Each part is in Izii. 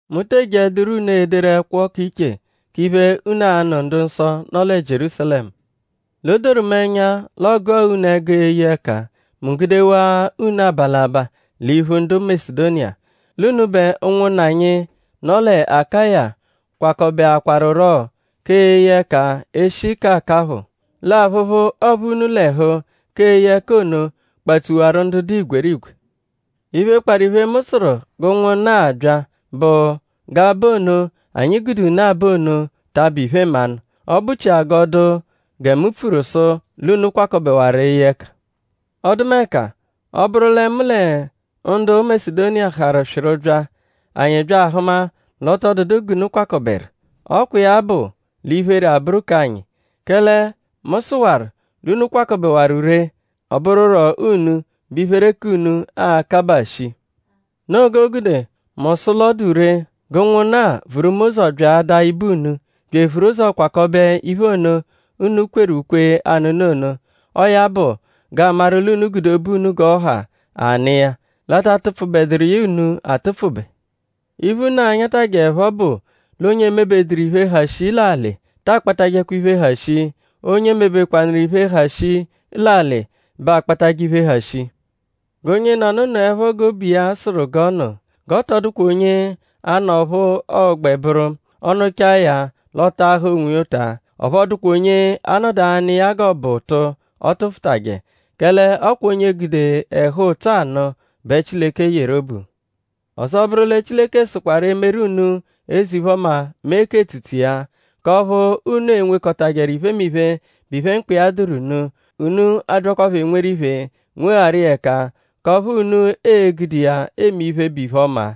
Mu te ejeẹduro unu ederu ẹkwo k'iche k'iphe, unu a-nụ ndu-nsọ, nọ lẹ Jierúsalẹmu. L'o doru mu ẹnya l'ọogua unu ẹgu eye ẹka; mu gudewaa unu aba l'abaa l'iphu ndu Masedoniya. L'unubẹ ụnwunna anyi, nọ lẹ Akaya kwakọbeakwaruro k'eye ẹka e -shi k'akaphụ. L'aphụphu, ọophu unu l'ẹhu k'eye ẹka ono kpatsuwaru ndu dụ igwerigwe. Iphe, kparụ iphe, mu sụru g'ụnwunna-a bya bụ g'aba ono, anyi gude unu aba ono ta abụ iphe-mmanụ. Ọ bụ-chia g'ọ dụ gẹ mu pfuru sụ l'unu kwakọbewaru eye ẹka. Ọdumeka; ọ -bụru lẹ mu lẹ ndu Masedoniya harụ swịru bya; anyi bya ahụma l'ọ tọ dụdu g'unu kwakọberu; ọ kwa iya bụ l'iphere abụru k'anyi; kẹle mu sụwaru l'unu kwakọbewaru ree; ọ bụruro unu bẹ iphere k'unu a-kabaa shii. Noo g'o gude mu sụ l'ọ dụ ree g'ụnwunna-a vuru mu ụzo byaadaa ibe unu bya evuru ụzo kwakọbe iphe ono, unu kweru ukwe anụnu ono. Ọo ya bụ g'aamaru l'unu gude obu unu g'ọ ha anụ iya; l'a ta atụpfubeduru iya unu atụpfube. Iphe, unu a-nyatajẹepho bụ l'onye emebeduru iphe, ha shii l'alị ta akpatajẹkwa iphe, ha shii. Onye mebekwanụru iphe, ha shii l'alị bẹ akpatajẹ iphe, ha shii. G'onyenọnu nụepho g'obu iya sụru g'ọ nụ. G'ọ tọ dụkwa onye a-nụ ọphu ọogbe bụru; ọ -nụchaa ya l'ọ taahaa onwiya ụta; ọphu ọ dụkwa onye anọdu anụ iya g'ọ bụ ụtu, ọ tụfutaje; kẹle ọ kwa onye gude ẹhu-ụtso anụ bẹ Chileke yeru obu. Ọzo bụru lẹ Chileke sụkwaru emeru unu eze-iphe-ọma mee k'etsutsu iya; k'ọphu unu e-nwekọtajeru iphemiphe, bụ iphe, mkpa iya dụru unu; unu abyakwaphọ enweru iphe nwegharu iya ẹka k'ọphu unu e-gude iya eme iphe, bụ iphe-ọma.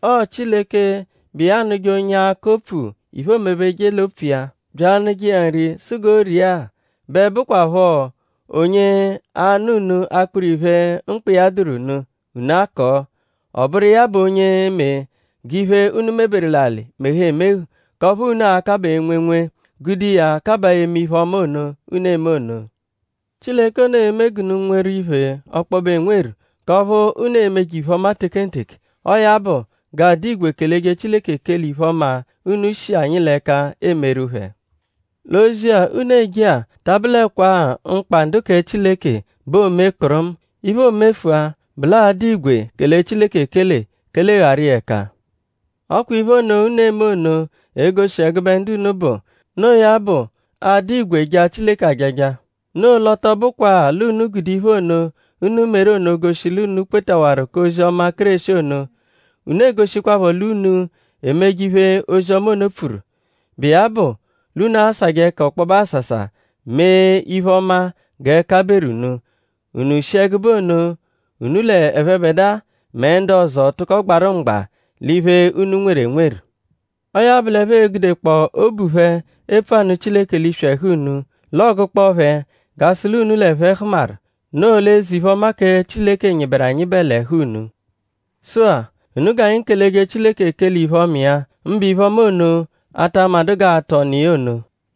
Ọo Chileke, bụ iya anụje onye akọ opfu iphe, oomebeje l'opfu iya; bya anụje iya nri sụ g'o ria-a; bẹ bụkwapho onye a-nụ unu akpụru-iphe, mkpa iya dụru unu; unu akọo. Ọ bụru iya bụ onye e-me g'iphe, unu meberu l'alị mehu emehu k'ọphu unu a-kabaa enwenwe; gude iya kabaa eme iphe-ọma ono, unu eme ono. Chileke ono e-me unu g'unu nweru iphe ọkpobe enweru k'ọphu unu e-meje iphe-ọma tekenteke; ọo ya bụ g'aa-dụ igwe keleje Chileke ekele iphe-ọma, unu shi anyi l'ẹka emeru phẹ. L'ozi-a, unu eje-a ta abụlekwa-a mkpa ndu kẹ Chileke bẹ oome kpụrumu. Iphe, o mefụa bụ l'aa-dụ igwe kele Chileke ekele kelegharu iya ẹka. Ọ kwa iphe ono, unu eme ono e-goshi ẹgube ndu unu bụ. Noo ya bụ aadụ igwe jaa Chileke ajaja. Noo l'ọ tọ bụkwaa l'unu gude iphe ono, unu meru ono goshi l'unu kwetawaru k'ozi-ọma Kéreshi ono; unu egoshikwaphọ l'unu emeje iphe, ozi-ọma ono pfuru. Bụ iya bụ l'unu asajẹ ẹka ọkpobe asasa mee iphe-ọma g'ẹka beru unu; unu shi ẹgube ono unu l'ẹphebedua mẹ ndu ọzo tụko gbarụ mgba l'iphe, unu nweru enweru. Ọo ya bụ l'ẹphe e-gudekpọo obu phẹ epfu anụ Chileke l'iswi ẹhu unu; l'ọogukpo phẹ g'a sụ l'unu l'ẹphe hụmaru; noo l'eze-iphe-ọma kẹ Chileke nyịberu anyịbe l'ẹhu unu. Sụ-a; unu g'anyi keleje Chileke ekele iphe-ọma iya; mbụ iphe-ọma ono, a ta amadụ g'aa-tụ ọnu iya ono.